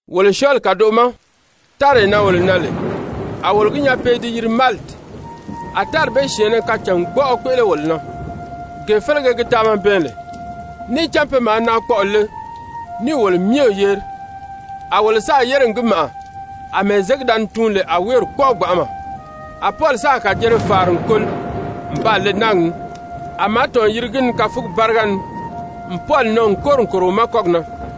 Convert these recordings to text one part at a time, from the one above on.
Wolo syɔɔli kàdoʔo ma, táree na wolo nan lè, a wolo gi nyaa pe i di yiri Maliti. A tári bee syɛ̀ɛnnɛ kacàngbɔʔɔ kpéʔele wolo na, gee félege gi taama bɛɛn lè. Níì cán pe maa naakpɔʔɔ le níì wolo myɛ yeri, a wolo sáà yére n gi màʔa àmɛɛ zěgi da ni tuun lè a wéeri kpɔ́ʔɔ gbanʔama. A Pɔli sáà kàjere fàari n koli n baa le náagi ni, a màátɔn yiri gi ni káfugi báriga ni n Pɔli nɔn n kóri n kòro wi ma kɔ́gi na.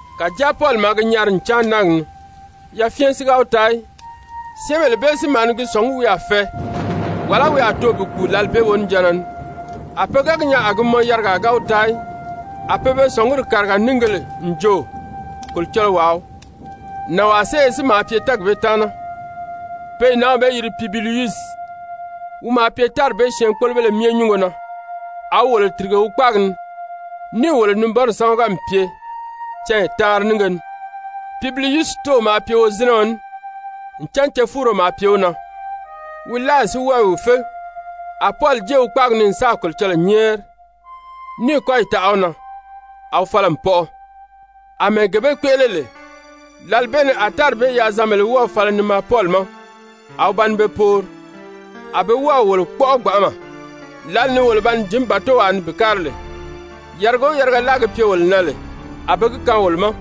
Kàjáa Pɔli maa gi nyari n cáan náagi ni, yafyɛn si ga wi taa í. Syɛ́ɛnbèle bee si maa ni gi sɔ̀ngí wi a fɛɛ, wàlá wi a too bi kùu lǎli bee wonijanna ni. A pe ga gi nyaa a gi mɔn yarigaa ga wi taa í, a pe be sɔ̀nguri kàriga níìgēle n jo, kolocɔlɔwaa wii. Nànwaa séye si maa pye tɛ́ɛgi bee taana, pe i nǎnw bee yiri Pubiliyusi, wi maa pye tári bee syɛɛnkpolobéle myɛ nyúngo na, a wi wolo tìrige wi kpáagi ni níì wolo nibɔnrɔ sámaga n pye canya taanri nínge ni. Pubiliyusi tóow maa pye wozinɛɔ ní, ncan cefuuro maa pye wi na, wi láayi si wɔ́ɔ i wi fé. A Pɔli jée wi kpáagi ni n sáà Kolocɔlɔɔ nyɛ́ɛri, níì kɔ́yi taʔa wi na, a wi fala n pɔʔɔ. Amɛɛ gee bee kpéʔele lè, lǎli bee ni a tári bee yaazanbèlē wɔ́ɔ̀ fala ni maa Pɔli ma, a wi ba ni be poori. A be wɔ́ɔ̀ wolo kpɔ́ʔɔ gbanʔama, lǎli ni wolo ba ni jǐn bàtowaa ni bi kári lè, yariga o yariga láa gi pye wolo na lè, a be gi kaan wolo ma.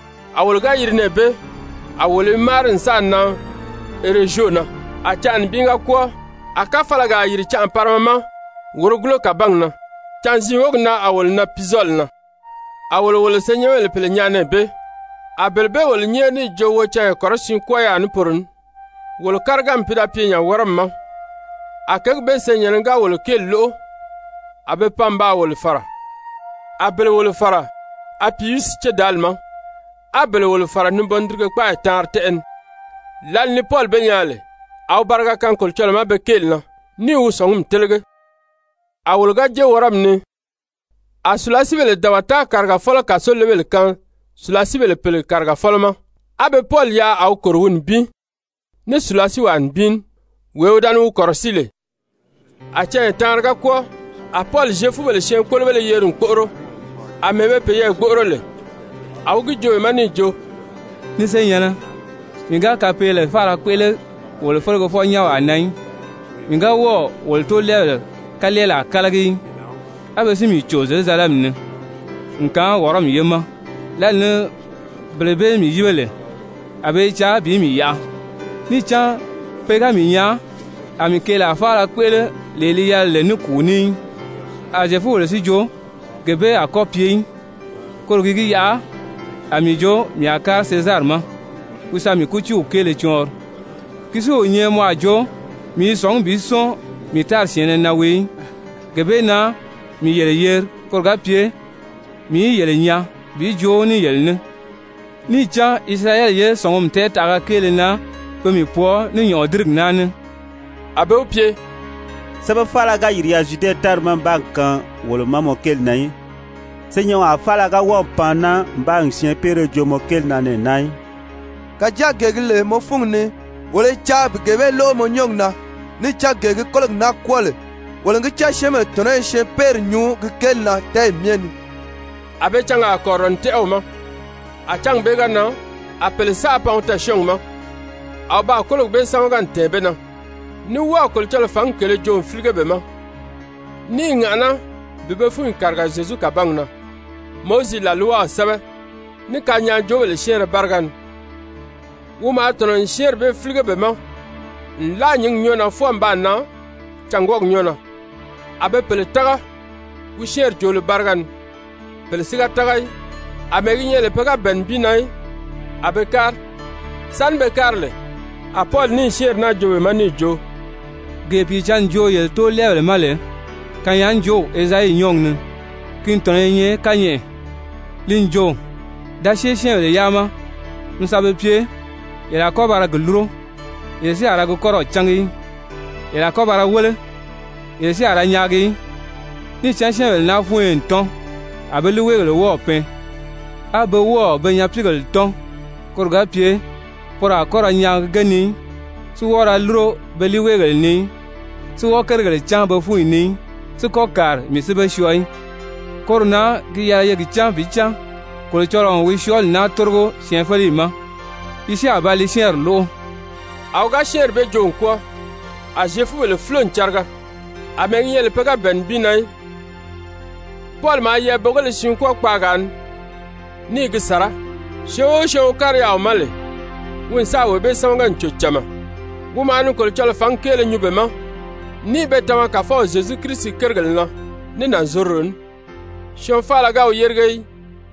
A wolo ga yiri nɛɛ bee, a wolo i máari n sáà nan Erezyo na. A canʔa nibin ga kwɔ́ɔ, a káfalagaa yìri canʔa parima ma wòrogulo kàbangi na, canziin wógi na a wolo nan Puzɔli na. A wolo wolo senyɛnbèle pèle nyaa nɛɛ bee, a bele bee wolo nyɛ́ɛri níì jo wo canya kɔrɔsiin kwɔ́ɔ yaà ní poro ní. Wolo káriganmi pi da pye nya Wɔrɔmi ma. A kěgi bee senyɛ̀nnɛ ga wolo kéeli lóʔo a be pan n baa wolo fàra, a bele wolo fàra Apiyusi Cédaali ma, á bele wolo fàra Nibɔndirige-kpáayi Taanri Tɛ́ʔɛ ni. Lǎli ni Pɔli be nyaa lè, a wi bariga kaan Kolocɔlɔɔ ma pe kéeli na níì wi sɔ̀ngumi télege. A wolo ga jée Wɔrɔmi ni, [a sùlasiibèle dabata kàrigafɔlɔ kàsolebèle kaan sùlasiibèle pèle kàrigafɔlɔ ma,] á be Pɔli yaʔa a wi kòro wi nibin ní sùlasiiwaa nibin ní, wee wi da ni wi kɔ̀rɔsíi lè. A canya taanri ga kwɔ́ɔ, a Pɔli Zyefubèle syɛɛnkpolobéle yeri n kpóʔoro. Amɛɛ be peyɛɛ gbóʔoro lè, a wi gi joo be ma níì jo: «Ni senyɛ̀nnɛ, mii ga kapeele faala kpéʔele wolo felegefɔ-nyɛ́nwaa na í, mii ga wɔ́ɔ̀ wolo tóolɛɛbèle kalɛɛlaa kálagi í, a be si mii cò Zyerusalɛmi ni n kaan Wɔrɔmi ye ma. Lǎli ni bele bee mii yíbe lè, a be i caa bi mii yaʔa, níì cán pe ga mii nyaa a mii keelaa faala kpéʔele lee li yɛlɛ lè ní kùu ní í. A Zyefubèle si jo gee bee a kɔ́ pye í, koro gi gi yaʔa a mii jo mii a kári Sezari ma wi sa mii kútiiw kéele cɔɔnri, ki si o nyɛ mɔ a jo mii i sɔ̀ngí bi sɔ́ɔn mii tári syɛ̀ɛnnɛ na wii í. Gee bee na mii yele yeri koro ga pye mii í yele nyaa bi joo ní yele ní. Níì cán Isirayɛli ye sɔ̀ngumi tɛɛtaʔaga kéele na pe mii pwɔɔ ní nyɔ̀ʔɔdirigi naa ní.» A be wi pye: «Sɛ́bɛ faala ga yìri yaà Zyude tári ma n baa kaan wolo ma mɔ kéeli na í, senyɛnwaa faala ga wɔ́ɔ̀ pan naa n baa syɛɛnpeere joo mɔ kéeli na nɛɛ naa í. Kàjáa gee gi lè mɔ fúngi ni, wolo i caa bi gee bee lóʔo mɔ nyɔ́ɔgi na, níì cán gee gi kólogi naa kwɔ́ɔ lè, wolo n gi cán syɛ́ɛnbèle tɔ̀nɔ́ i syɛɛnpeeri nyuu gi kéeli na tɛ́ɛyi myɛ ni.» A be cangaa kɔ̀rirɔ n tɛ́ʔɛ wi ma, a cángi bee ga nan, a pèle saʔa pan wi tɛɛ̀syɔɔngi ma a wi baa kólogi bee sámaga n tɛ̀ɛn be na, ní wɔ́ɔ̀ Kolocɔlɔɔ fǎngi kèlē joo n fílige be ma, ní i ŋàʔaná bi be fúnyi kàriga Zyezu kàbangi na Mowizi làlwaw sɛ́bɛ, ní kanyaajoobèle syɛ́ɛnrɛ báriga ni. Wi maa tɔ̀nɔ n syɛ́ɛnri bee fílige be ma nlaa nyǐngi nyɔ́ɔ na fwɔɔ n sáà nan cângwɔɔgi nyɔ́ɔ na. A be pèle tága wi syɛ́ɛnri joolo báriga ni, pèle si ga tága í. Amɛɛ gi nyɛ lè pe ga bɛ̀ɛ nibin na í, a be kári. Sáni be kári lè, a Pɔli níì syɛ́ɛnri naa joo be ma níì jo: «Gee Pìicǎnni joo yele tóolɛɛbèle ma lè kanyaajoow Ezayi nyɔ́ɔgi ni, ki tɔ̀nɔ i nyɛ kányɛʔɛ, li n jo: ‹Da syée syɛ́ɛnbèle yaa ma mi sa be pye: Yele a kɔ́ ba ra gi lúro, yele si a ra gi kɔ́rɔw cángi í, yele a kɔ́ ba ra wéle, yele si a ra nyaagi í. Níì cán syɛ́ɛnbèle naa fúnyo n tɔ́n, a be líiweegèle wɔ́ɔ̀ pɛɛn, á be wɔ́ɔ̀ be nyapiigèle tɔ́n, koro ga pye poro a kɔ́ ra nyaagi ge ni í, si wɔ́ɔ ra lúro be líiweegèle ni í, si wɔ́ɔ kérigèle cán be fúnyi ni í, si kɔ́ kàri, mii si be syɔɔ í.› Koro na gi yɛlɛ ye gi cán bi cán Kolocɔlɔɔ n wi syɔɔli naa tórigo syɛɛnfeleyi ma, yi si a ba li syɛ́ɛnri lóʔo.» [ A wi ga syɛ́ɛnri bee joo n kwɔ́ɔ, a Zyefubèle fúlo n cariga, àmɛɛ gi nyɛ lè pe ga bɛ̀ɛ nibin na í.] Pɔli maa yɛɛbogéle siin kwɔ́ɔ kpaagaa ni ní i gi sàrá. Syɔɔn o syɔɔn wi kári yaà wi ma lè, wi n sáà wee bee sámaga n cò cama. Wi maa ni Kolocɔlɔɔ fǎngi kéele nyuu be ma, ní i be tama Kàfɔw Zyezu Kirisi kérigèle na ní nànzorodo ní, syɔɔn faala ga wi yérige í.